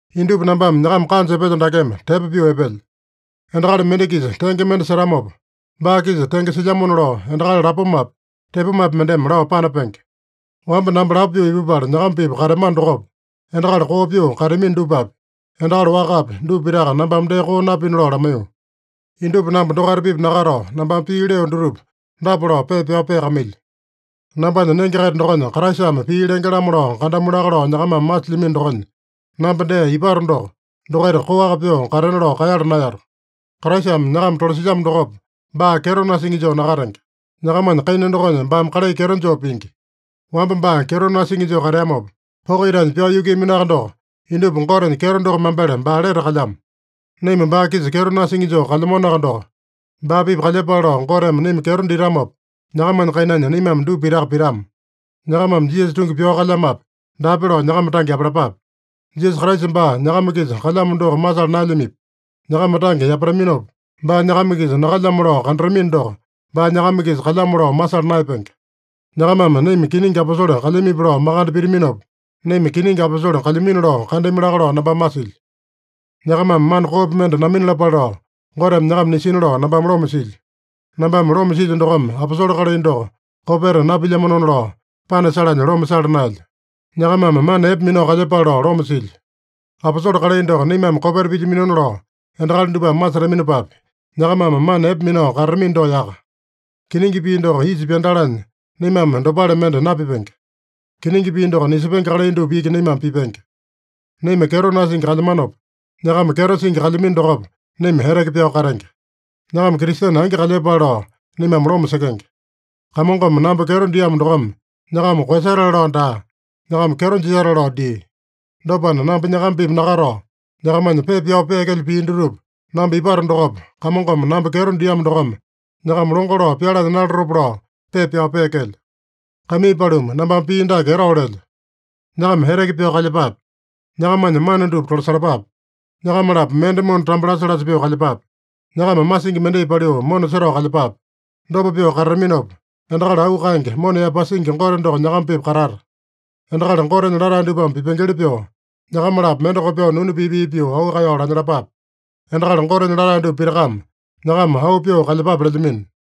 Indupa nambame nyakama kanja epelyo dakeme, tepo pyoo epelyo. Endakali mende-kisa tenge mende setamopa, baa-kisa tenge silyamona lao, endakali lapomapi, tepomapi mendeme lao panapenge. Wamba namba lapo pyoo ipupala nyakama-pipa kateamano dokopa, endakali koo pyoo kateamino dupapi, endakali wakapi, dupa pitaka nambame dee koo napina lao lamaiyo. Indupa namba dokaita-pipa nakatao, nambame pii leo dutupa dapa lao pepa pyao peakamailyo: Nambanya nenge-kaita dokonya Kraisame pii lenge-lamo lao kandamu laka lao nyakamame masilyamino dokonya, namba dee ipato doko, dokaita koaka pyoo katena lao kaeyala naeyato. Kraisame nyakama tolasilyamo dokopa, baa kyeto nasingi joo nakatenge. Nyakamanya kaina dokonya baame kalai kyeto joo pingi. Wamba baa kyeto nasingi joo kateamopa, poko itanya pyao yukuiyaminoaka doko, indupa Gotenya kyeto doko mambele baa lete kalyamo. Naima baa-kisa kyeto nasingi joo kalyamanoaka doko, baa-pipa kalyepale lao Goteme naima kyeto ditamopa, nyakamanya kainanya naimame dupa pitaka pitama. Nyakamame Jisasa tungi pyao kalyamape, daape lao nyakama tange yapalapape. Jisasa Kraisa baa nyakama-kisa kalyamo doko masala naelyamipi? Nyakama tange yapataminopa, baa nyakama-kisa nakalyamo lao kandatamino doko, baa nyakama-kisa kalyamo lao masala naeyapenge. Nyakamame naima kiningi aposole kalyamipi lao makande pitaminopa, naima kiningi aposole kalyamino lao kandami laka lao nambame masilyo. Nyakamame mana koopi mende naminalapale lao, Goteme nyakama nisina lao nambame loma silyo. Nambame loma silyo dokome aposole kalai doko kopeta napilyamanona lao panasalanya loma sala naelyo. Nyakamame mana epe minao kalyepale lao loma silyo. Aposole kalai doko naimame kopeta pilyaminona lao endakali dupame masetaminopapi, nyakamame mana epe minao katatamino doko yaka. Kiningi pii doko isa pyandalanya naimame dopale mende napipenge. Kiningi pii doko nisepenge kalai dupa iki naimame pipenge. Naima kyeto nasingi kalyamanopa, nyakama kyeto singi kalyamino dokopa, naima eteke pyao katenge. Nyakama Kristene angi kalyepale lao naimame loma sekenge. Kamongome namba kyeto diamo dokome nyakama koeyasatale lao daa, nyakama kyeto jisatale lao dia. Dopana, namba nyakama-pipa nakatao, nyakamanya pepa pyao peekelyo pii dutupa, namba ipato dokopa, Kamongome namba kyeto diamo dokome nyakama longo lao pyalanya nalatopa lao pepa pyao peekelyo. Kaimii paluma, nambame pii dake etao lelyo: Nyakama eteke pyao kalyepape. Nyakamanya mana dupa tolasalapape. Nyakama-lapo mende mona tambo lasa-lasa pyoo kalyepape. Nyakama masingi mendai paliu mona setao kalyepape. Dopa pyoo katataminopa, endakali auu kaenge, mona yaepasingi Gote doko nyakama-pipa katata. Endakali Gotenya latae dupame pipengeli pyoo, nyakama-lapo mende kopyoo nunu pii-pii pyoo auu kaeyao lanyalapape. Endakali Gotenya latae dupa pitakame nyakama auu pyoo kalyepape lelyamino.